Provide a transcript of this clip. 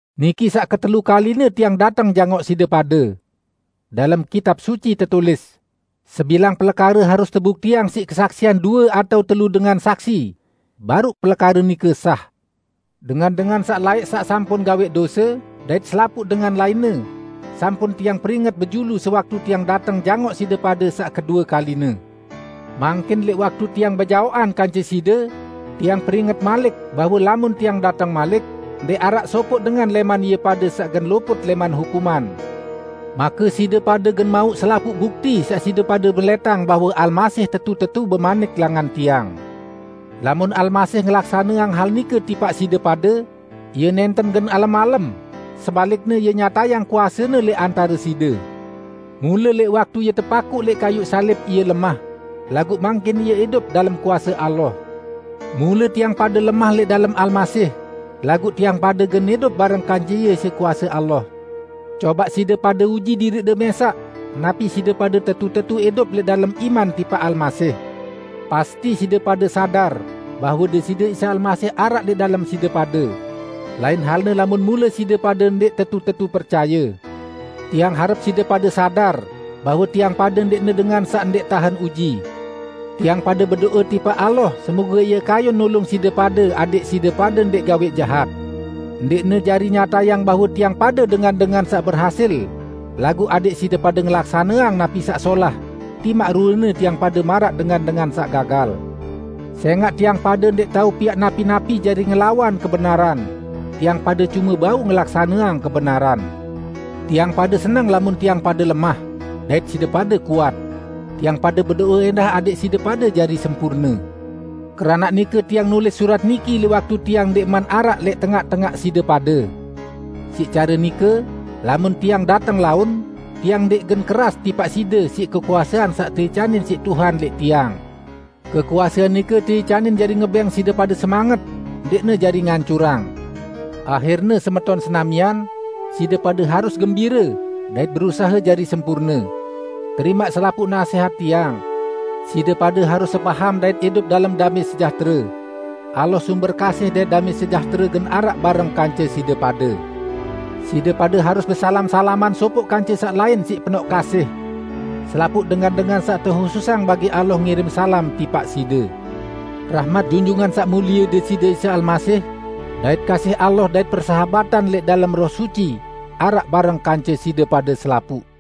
Niki saq ketelu kaline tiang dateng jangoq side pade. Dalem Kitab Suci tetulis, "Sebilang pelekare harus tebuktiang siq kesaksian due atao telu dengan saksi, baruq pelekare nike sah." Dengan-dengan saq laẽq saq sampun gawẽq dose dait selapuq dengan lainne, sampun tiang peringet bejulu sewaktu tiang dateng jangoq side pade saq kedue kaline. Mangkin, lẽq waktu tiang bejaoqan kance side, tiang peringet malik bahwe lamun tiang dateng malik, ndẽq araq sopoq dengan lẽman ie pade saq gen luput lẽman hukuman. Make side pade gen mauq selapuq bukti saq side pade melẽtang bahwe Almasih tetu-tetu bemanik langan tiang. Lamun Almasih ngelaksaneang hal nike tipaq side pade, Ie nẽnten gen alem-alem, sebalikne Ie nyatayang kuase-Ne lẽq antare side. Mule lẽq waktu Ie tepakuq lẽq kayuq salib Ie lemah, laguq mangkin Ie idup dalem kuase Allah. Mule tiang pade lemah lẽq dalem Almasih, laguq tiang pade gen idup bareng kance Ie siq kuase Allah. Cobaq side pade uji diriqde mẽsaq napi side pade tetu-tetu idup lẽq dalem iman tipaq Almasih! Pasti side pade sadar bahwe Deside Isa Almasih araq lẽq dalem side pade! -- lain halne lamun mule side pade ndẽq tetu-tetu percaye. Tiang harep side pade sadar bahwe tiang pade ndẽqne dengan saq ndẽq tahen uji. Tiang pade bedo'e tipaq Allah semoge Ie kayun nulung side pade adẽq side pade ndẽq gawẽq jahat. Ndẽqne jari nyatayang bahwe tiang pade dengan-dengan saq berhasil, laguq adẽq side pade ngelaksaneang napi saq solah, timaq ruene tiang pade maraq dengan-dengan saq gagal. Sẽngaq tiang pade ndẽq tao piaq napi-napi jari ngelawan kebenaran; tiang pade cume bau ngelaksaneang kebenaran. Tiang pade seneng lamun tiang pade lemah, dait side pade kuat. Tiang pade bedo'e ẽndah adẽq side pade jari sempurne. Keranaq nike tiang nulis surat niki lẽq waktu tiang ndẽqman araq lẽq tengaq-tengaq side pade. Siq care nike, lamun tiang dateng laun, tiang ndẽq gen keras tipaq side siq kekuasean saq teicanin siq Tuhan lẽq tiang. Kekuasean nike teicanin jari ngebẽng side pade semanget, ndẽqne jari ngancurang. Ahirne, semeton senamian, side pade harus gembire, dait berusahe jari sempurne. Terimaq selapuq nasẽhat tiang. Side pade harus sepaham dait idup dalem damẽ sejahtere. Allah sumber kasih dait damẽ sejahtere gen araq bareng kance side pade. Side pade harus besalam-salaman sopoq kance saq lain siq penoq kasih. Selapuq dengan-dengan saq tehususang bagi Allah ngirim salam tipaq side. Rahmat Junjungan Saq Mulie Deside Isa Almasih dait kasih Allah dait persahabatan lẽq dalem Roh Suci araq bareng kance side pade selapuq!